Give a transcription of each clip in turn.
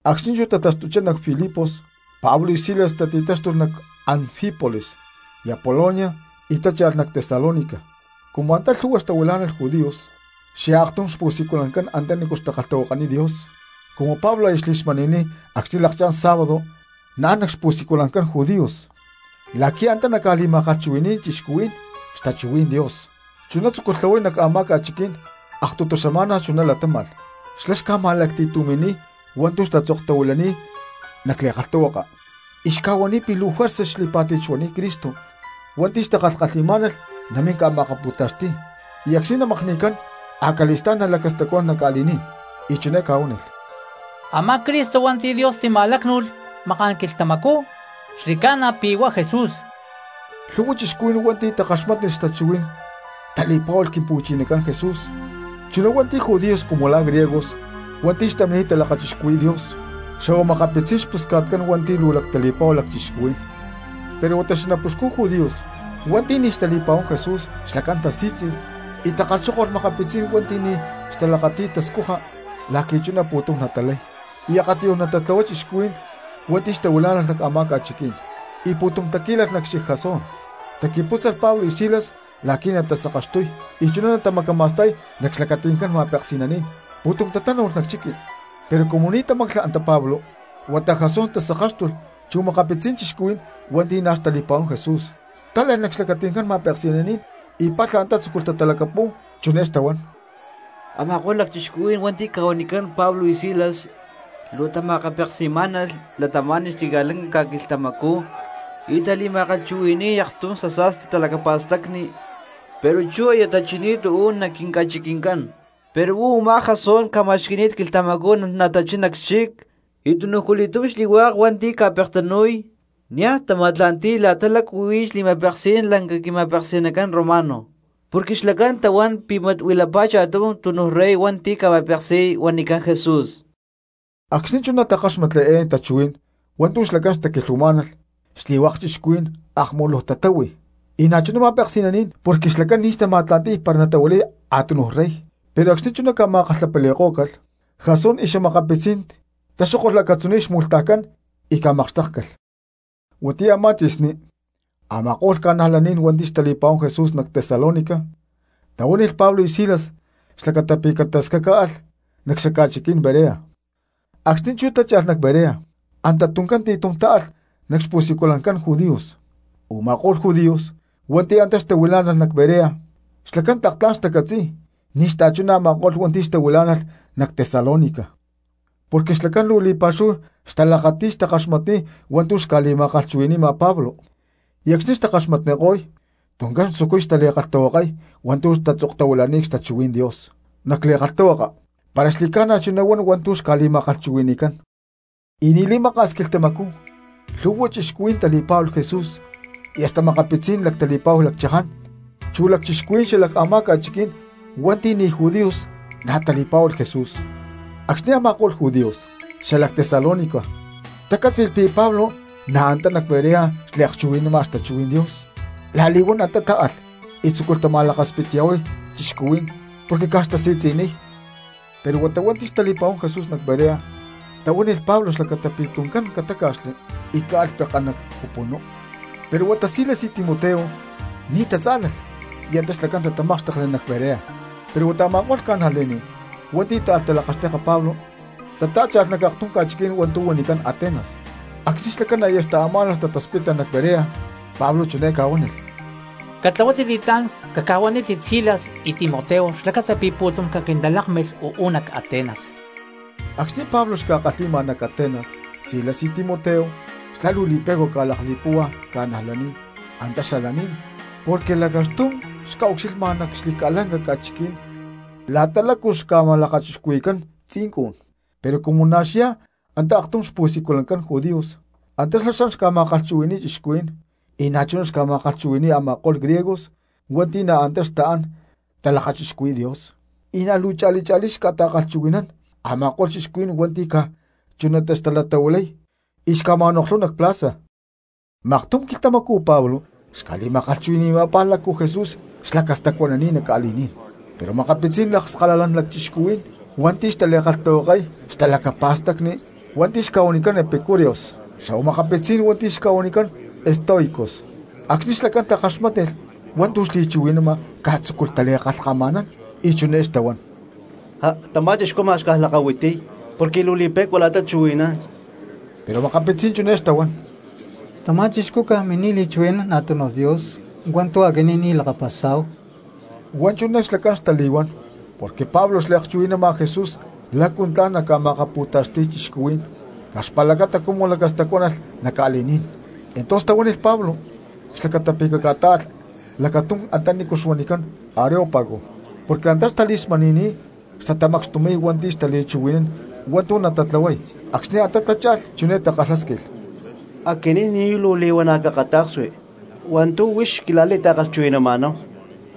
Acxni̠ chú tataxtuchá nac Filipos Pablo y Silas tati̠táxtulh nac Anfípolis y Apolonia y tácha̠lh nac Tesalónica; cumu antá lhu̠hua xtahuilá̠nalh judíos xyá aktum xpu̠siculancán antanícu xtakalhtahuakaniy Dios. Cumu Pablo chuná xli̠smani̠ni̠t acxni̠ lákchá̠n sábado naán cxpu̠siculancán judíos la̠qui̠ antá naca̠ma̠kalhchuhui̠ni̠y cristianos xtachuhuí̠n Dios chuná tzúculh tláhuay nac a̠má ca̠chiquí̠n, aktutu xama̠na chuná latáma̠lh. Xlá xca̠ma̠lacti̠tumi̠niy hua̠ntu̠ tatzoktahuilani̠t nac li̠kalhtahuaka, y xca̠huaniy pi̠ luu juerza xli̠pá̠ti̠t xuani̠t Cristo hua̠nti̠ xtakalhkalhi̠má̠nalh namín ca̠ma̠akapu̠taxti̠y, y acxni̠ namakni̠cán acali̠stá̠n nalacastacuanán nac ca̠li̠ní̠n. Y chiné ca̠huánilh; —Amá Cristo hua̠nti̠ Dios tima̠lácnu̠lh maká̠n quilhtamacú xli̠ca̠na pi̠ huá Jesús. Lhu̠hua cristianos hua̠nti̠ takaxmátnilh xtachuhuí̠n tali̠pá̠hualh Quimpu̠chinacán Jesús chuná hua̠nti̠ judíos cumu la̠ griegos hua̠nti̠ xtamini̠t talakachixcuhui̠y Dios, xa̠hua makapitzí̠n xpusca̠tcán hua̠nti̠ luu lactali̠pa̠hu lacchixcuhuí̠n. Pero huata xanapuxcun judíos hua̠nti̠ ni̠ xtali̠pa̠huán Jesús xlacán tasí̠tzi̠lh y takalhxókolh makapitzí̠n hua̠nti̠ ni̠ xtalakati̠y tascuja la̠qui̠ chuná pu̠tum natalay y akatiyuj natatlahuay cristianos hua̠nti̠ xtahuilá̠nalh nac a̠má ca̠chiquí̠n. Y pu̠tum taquí̠lalh nac xchic Jasón, taqui̠pútzalh Pablo y Silas la̠qui̠ natasakaxtuy y chuná natamacama̠sta̠y nac xlacati̠ncán ma̠peksi̠naní̠n. Pu̠tum tatánu̠lh nac chiqui, pero cumu ni̠ tamáclalh antá Pablo huata Jasón tasakáxtulh chu makapitzí̠n cristianos hua̠nti̠ na̠ xtali̠pa̠huán Jesús, tále̠lh nac xlacati̠ncán ma̠peksi̠naní̠n y palha antá tzúculh tatalacapu̠y, chiné xtahuán: —Ama̠ko̠lh lacchixcuhuí̠n hua̠nti̠ ca̠huanicán Pablo y Silas luu tama̠akapeksi̠má̠nalh cristianos xli̠ca̠lanca ca̠quilhtamacú y tali̠ma̠kalhchuhui̠ni̠y aktum xasa̠sti talacapa̠stacni, pero chú aya tachini̠t uú nac quinca̠chiqui̠ncán. Pero huá u̠má Jasón ca̠ma̠xqui̠ni̠t quilhtamacú natachín nac xchic y tunujculi̠túm xli̠hua̠k hua̠nti̠ ca̠pektanu̠y niaj tama̠tla̠nti̠y la̠ta lácu huí xli̠ma̠peksí̠n lanca quima̠peksi̠nacán romano, porque xlacán tahuán pi̠ mat huilapá cha̠tum túnuj rey hua̠nti̠ ca̠ma̠peksi̠y huanicán Jesús. Acxni̠ chuná takáxmatli eé tachuhuí̠n hua̠ntu̠ xlacán xtaquilhuamá̠nalh xli̠hua̠k cristianos akmuluj tatáhui y na̠chuná ma̠peksi̠naní̠n porque xlacán ni̠ xtama̠tla̠nti̠y para natahuilay a̠tunuj rey. Pero acxni̠ chuná ca̠ma̠kalhapali̠kó̠calh Jasón y xa̠makapitzí̠n taxókolh acatzuní̠n xmu̠lhtajcán y ca̠makxtékcalh. Huatiyá a̠má tzi̠sní a̠ma̠ko̠lh cristianos hua̠nti̠ xtali̠pa̠huán Jesús nac Tesalónica tahuánilh Pablo y Silas xlacata pi̠ catascacáalh nac xaca̠chiquí̠n Berea. Acxni̠ chú tácha̠lh nac Berea anta tuncán ti̠tum táalh nac xpu̠siculancán judíos. Uma̠kó̠lh judíos hua̠nti̠ antá xtahuilá̠nalh nac Berea xlacán tlak tla̠n xtacatzi̠y ni̠ xta̠chuná a̠ma̠ko̠lh hua̠nti̠ xtahuilá̠nalh nac Tesalónica, porque xlacán luu li̠pa̠xúhu xtalakati̠y xtakaxmatniy hua̠ntu̠ xca̠li̠ma̠kalhchuhui̠ni̠ma Pablo y acxni̠ xtakaxmatniko̠y tuncán xtzucuy tali̠kalhtahuakay hua̠ntu̠ tatzoktahuilani̠t xtachuhuí̠n Dios nac li̠kalhtahuaka para xli̠ca̠na chuná huan hua̠ntu̠ xca̠li̠ma̠kalhchuhui̠ni̠cán. Y ni̠ li̠maka̠s quilhtamacú lhu̠hua cristianos tali̠pá̠hualh Jesús; y hasta makapitzí̠n lactali̠pa̠hua lacchaján chu lacchixcuhuí̠n xala a̠má ca̠chiquí̠n hua̠nti̠ ni̠ judíos na̠ tali̠pá̠hualh Jesús. Acxni̠ a̠ma̠ko̠lh judíos xalac Tesalónica tacátzi̠lh pi̠ Pablo antá nac Berea xliakchuhui̠nama xtachuhuí̠n Dios, la̠li̠huán antá táalh y tzúculh tama̠lakaspitya̠huay cristianos porque caj xtasi̠tzi̠niy. Pero huata hua̠nti̠ xtali̠pa̠huán Jesús nac Berea tahuánilh Pablo xlacata pi̠ tuncán catáca̠xli y caalh pekán nac pupunú, pero huata Silas y Timoteo ni̠ tatzá̠lalh y antá xlacán tatamákxtekli nac Berea. Pero huata a̠ma̠ko̠lh cristianos hua̠nti̠ táalh talakaxteka Pablo tatá̠cha̠lh nac aktum ca̠chiquí̠n hua̠ntu̠ huanicán Atenas. Acxni̠ xlacán aya xtaamá̠nalh tataspita nac Berea Pablo chiné ca̠huánilh: —Catlahuátit li̠tlá̠n caca̠huanítit Silas y Timoteo xlacata pi̠ tuncán caquintalákmilh uú nac Atenas. Acxni̠ Pablo xca̠kalhi̠ma nac Atenas Silas y Timoteo, xlá luu li̠pe̠cua ca̠lakli̠púhua cristianos antá xalaní̠n porque lacaxtum xca̠ucxilha nac xli̠ca̠lanca ca̠chiquí̠n la̠ta lácu xca̠lakachixcuhui̠cán tzincun. Pero cumu na̠ xyá antá aktum xpu̠siculancán judíos antá xlá xan ca̠ma̠kalhchuhui̠ni̠y cristianos, y na̠chuná xca̠ma̠kalhchuhui̠ni̠y a̠ma̠ko̠lh griegos hua̠nti̠ na̠ antá xtaán talakachixcuhui̠y Dios, y na̠ luu cha̠li cha̠lí xca̠ta̠kalhchuhui̠nán a̠ma̠ko̠lh cristianos hua̠nti̠ caj chunatá xtalatahuilay y xca̠ma̠noklhuy nac plaza. Maktum quilhtamacú Pablo xca̠li̠ma̠kalhchuhui̠ni̠ma la̠ta lácu Jesús lacastacuánalh nac ca̠li̠ní̠n, pero makapitzí̠n lakskalala lacchixcuhuí̠n hua̠nti̠ xtali̠kalhtahuakay xtalacapa̠stacni hua̠nti̠ xca̠huanicán epicúreos xa̠huá makapitzí̠n hua̠nti̠ xca̠huanicán estoicos, acxni̠ xlacán takaxmátnilh hua̠ntu̠ xli̠chuhui̠nama caj tzúculh tali̠kalhkama̠nán y chiné xtahuán: —¡Já! Tamá chixcú ma̠x caj lakahuitiy porque luu li̠pe̠cua la̠ta chuhui̠nán. Pero makapitzí̠n chiné xtahuán: —Tamá chixcú caj mini̠t li̠chuhui̠nán a̠tunuj dios hua̠nti̠ aquinín ni̠ lakapasá̠hu. Huá chuná xlacán xtali̠huán porque Pablo xliakchuhui̠náma Jesús lácu tla̠n naca̠ma̠akapu̠taxti̠y cristianos caj xpa̠lacata cumu lacastacuánalh nac ca̠li̠ní̠n. Entonces tahuánilh Pablo xlacata pi̠ caca̠tá̠alh lacatum antanícu huanicán Areópago porque antá xtali̠smani̠ni̠t xtatamacxtumi̠y hua̠nti̠ xtali̠lacchuhui̠nán hua̠ntu̠ natatlahuay. Acxni̠ antá tatá̠cha̠lh chiné takalhásquilh: —Aquinín ni̠ luu li̠huana̠ cakata̠ksui hua̠ntu̠ huix xquila̠li̠ta̠kalhchuhui̠nama̠náhu,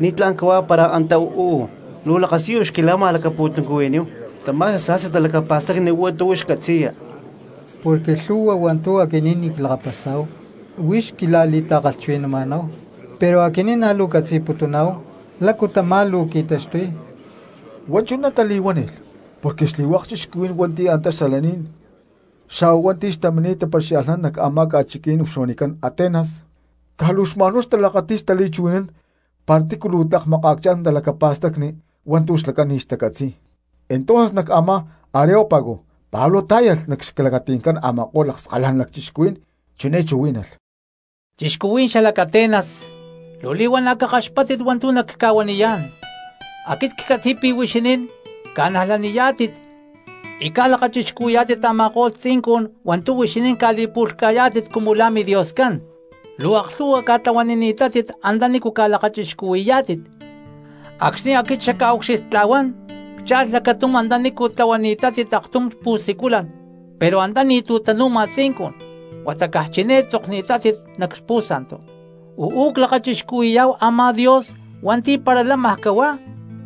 ¿ni̠tlá̠n cahuá para antá uú luu lakasiyu xquila̠ma̠lacapu̠tuncuhui̠níhu tamá xasa̠sti talacapa̠stacni hua̠ntu̠ huix catzi̠ya? Porque lhu̠hua hua̠ntu̠ aquinín ni̠ clakapasa̠hua huix xquila̠li̠ta̠kalhchuhui̠nama̠náhu, pero aquinín na̠ luu ccatzi̠putuná̠hu lácu tamá luu qui̠taxtuy. Huá chuná tali̠huánilh porque xli̠hua̠k cristianos hua̠nti̠ antá xalaní̠n xa̠huá hua̠nti̠ xtamini̠t tapaxia̠lhnán nac a̠má ca̠chiquí̠n huanicán Atenas caj luu xma̠n huá xtalakati̠y xtali̠chuhui̠nán para tícu tlak makaacchá̠n talacapa̠stacni hua̠ntu̠ xlacán ni̠ xtacatzi̠y. Entonces nac a̠má Areópago Pablo tá̠yalh nac xlacati̠ncán a̠ma̠ko̠lh lakskalala lacchixcuhuí̠n chiné chuhuí̠nalh: —¡Cristianos xalac Atenas! Luu li̠huana̠ xkaxpáttit hua̠ntu̠ nacca̠huaniyá̠n. Aquit ccatzi̠y pi̠ huixinín ca̠ca̠najlaniyá̠tit y ca̠lakachixcuhui̠yá̠tit a̠ma̠ko̠lh tzincun hua̠ntu̠ huixinín ca̠li̠pu̠lhca̠yá̠tit cumu la̠ midioscán. Luu aklhu̠hua ca̠tlahuanini̠tátit antanícu ca̠lakachixcuhui̠yá̠tit, acxni̠ aquit xacca̠ucxilhtla̠huán ccha̠lh lacatum antanícu tlahuani̠tátit aktum xpu̠siculan pero antá ni̠tu̠ tanu̠ma tzincun, huata caj chiné tatzokni̠t nac pu̠santu: “Uú clakachixcuhui̠yá̠hu a̠má Dios hua̠nti̠ para lámaj cahuá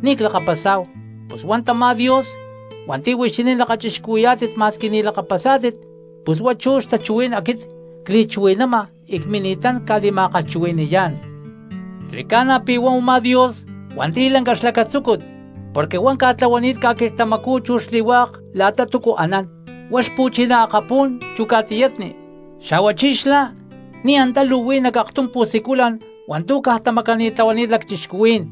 ni̠ clakapasá̠hu.” Pus hua̠ntamá Dios hua̠nti̠ huixinín lakachixcuhuí̠yá̠tit ma̠squi ni̠ lakapasá̠tit, pus huá chú xtachuhuí̠n aquit cli̠chuhui̠nama y cmini̠tán ca̠li̠ma̠kalhchuhui̠ni̠yá̠n. ’Xli̠ca̠na pi̠ huá u̠má Dios hua̠nti̠ lanca xlacatzúcut porque huá ca̠tlahuani̠t ca̠quilhtamacú chu xli̠hua̠k la̠ta túcu anán, huá xpu̠chiná akapú̠n chu ca̠tiyatni, xa̠huachí xlá ni̠ antá luu huí nac aktum pu̠siculan hua̠ntu̠ caj tamacani̠tlahuani̠t lacchixcuhuí̠n.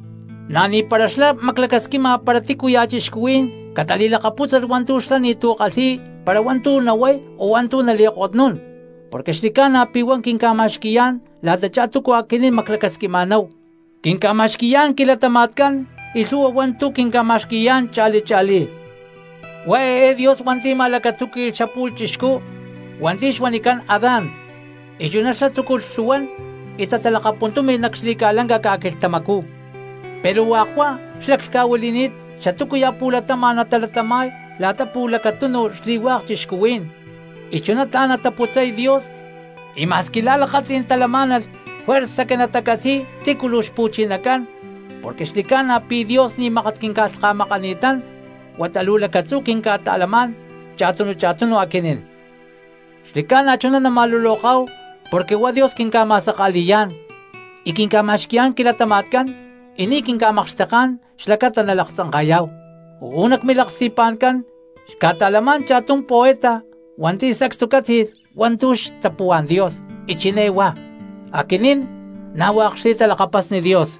Na̠ ni̠para xlá maclacasquima para tícuya̠ cristianos catali̠lakapútzalh hua̠ntu̠ xlá ni̠tu̠ kalhi̠y para hua̠ntu̠ nahuay o hua̠ntu̠ nali̠kotnún, porque xli̠ca̠na pi̠ huá quinca̠ma̠xqui̠yá̠n la̠tachá túcu aquinín maclacasquima̠náhu, quinca̠ma̠xqui̠yá̠n quilatama̠tcán y lhu̠hua hua̠ntu̠ quinca̠ma̠xqui̠yá̠n cha̠li cha̠lí. ’Huá eé Dios hua̠nti̠ ma̠lacatzúqui̠lh xapu̠lh chixcú hua̠nti̠ xuanicán Adán, y chuná xlá tzúculh lhu̠huán y tatalakapuntúmi̠lh nac xli̠ca̠lanca ca̠quilhtamacú; pero hua̠k huá xlaclhca̠huili̠ni̠t xatúcuya̠ pu̠latama̠n natalatama̠y la̠ta pu̠lacatunu xli̠hua̠k cristianos, y chuná tla̠n nataputzay Dios y ma̠squi la̠ lakatzí̠n talamá̠nalh juerza que natacatzi̠y tícu luu xpu̠chinacán, porque xli̠ca̠na pi̠ Dios ni̠ mákat quinca̠lhka̠makani̠tán huata luu lacatzú quinca̠ta̠lamá̠n cha̠tunu cha̠tunu aquinín. Xli̠ca̠na chuná nama̠luloká̠hu porque huá Dios quinca̠ma̠saka̠li̠yá̠n, y quinca̠ma̠xqui̠yá̠n quilatama̠tcán y ni̠ quinca̠makxteká̠n xlacata nalaktzanka̠yá̠hu. Uú nac milaksti̠pa̠ncán xca̠ta̠lamá̠n cha̠tum poeta hua̠nti̠ sacstu cátzi̠lh hua̠ntu̠ xtapuhuá̠n Dios y chiné huá: “¡Aquinín na̠ hua̠k xli̠talakapasni Dios!”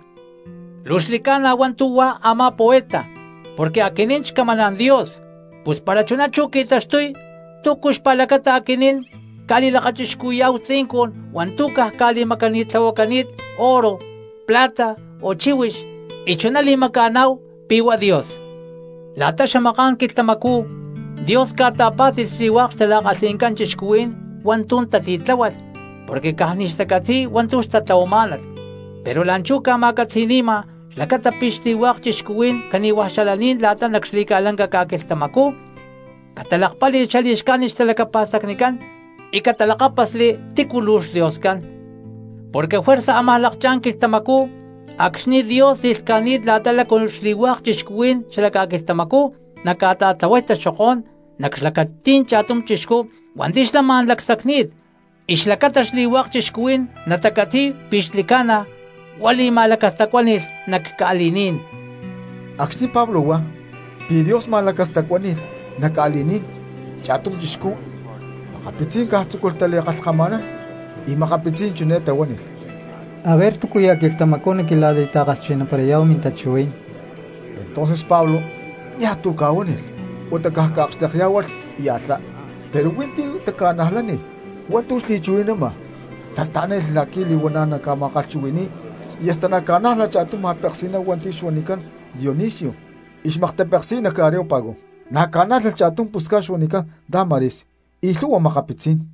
Luu xli̠ca̠na hua̠ntu̠ huá a̠má poeta porque aquinín xcamaná̠n Dios, pus para chuná chú qui̠taxtuy, ¿túcu xpa̠lacata aquinín ca̠li̠lakachixcuhui̠yá̠hu tzincun hua̠ntu̠ caj ca̠li̠macani̠tlahuacani̠t oro, plata o chíhuix, y chuná li̠maca̠ná̠hu pi̠ huá Dios? La̠ta xamaká̠n quilhtamacú Dios ca̠ta̠pá̠ti̠lh xli̠hua̠k xtala̠kalhi̠ncán cristianos hua̠ntu̠ tatitláhualh porque caj ni̠ xtacatzi̠y hua̠ntu̠ xtatlahuamá̠nalh, pero la̠nchú ca̠ma̠catzi̠ni̠ma xlacata pi̠ xli̠hua̠k cristianos cani̠huaj xalaní̠n la̠ta nac xli̠ca̠lanca ca̠quilhtamacú catalakpáli̠lh xali̠xcájnit xtalacapa̠stacnicán y catalakápasli tícu luu xDioscán. Porque juerza ámaj lakchá̠n quilhtamacú acxni̠ Dios li̠lhca̠ni̠t la̠ta lácu xli̠hua̠k cristianos xala ca̠quilhtamacú naca̠ta̠tlahuay taxokó̠n nac xlacatí̠n cha̠tum chixcú hua̠nti̠ xlá ma̠n lacsacni̠t, y xlacata xli̠hua̠k cristianos natacatzi̠y pi̠ xli̠ca̠na huá li̠ma̠lacastacuáni̠lh nac ca̠li̠ní̠n. Acxni̠ Pablo huá pi̠ Dios ma̠lacastacuáni̠lh nac ca̠li̠ní̠n cha̠tum chixcú, makapitzí̠n caj tzúculh tali̠kalhkama̠nán, y makapitzí̠n chiné tahuánilh: —Aver túcuya̠ quilhtamacú naquila̠li̠ma̠kalhchuhui̠ni̠parayá̠hu mintachuhuí̠n. Entonces Pablo niaj tu̠ ca̠huánilh huata caj ca̠akxtekyá̠hualh y alhá. Pero huí ti̠ taca̠najlánilh hua̠ntu̠ xli̠chuhui̠nama y tasta̠lánilh la̠qui̠ li̠huana̠ naca̠ma̠kalhchuhui̠ni̠y y hasta na̠ ca̠nájlalh cha̠tum ma̠peksi̠ná hua̠nti̠ xuanicán Dionisio y xmaktapeksi̠y nac Areópago, na̠ ca̠nájlalh cha̠tum pusca̠t xuanicán Dámaris y lhu̠hua makapitzí̠n.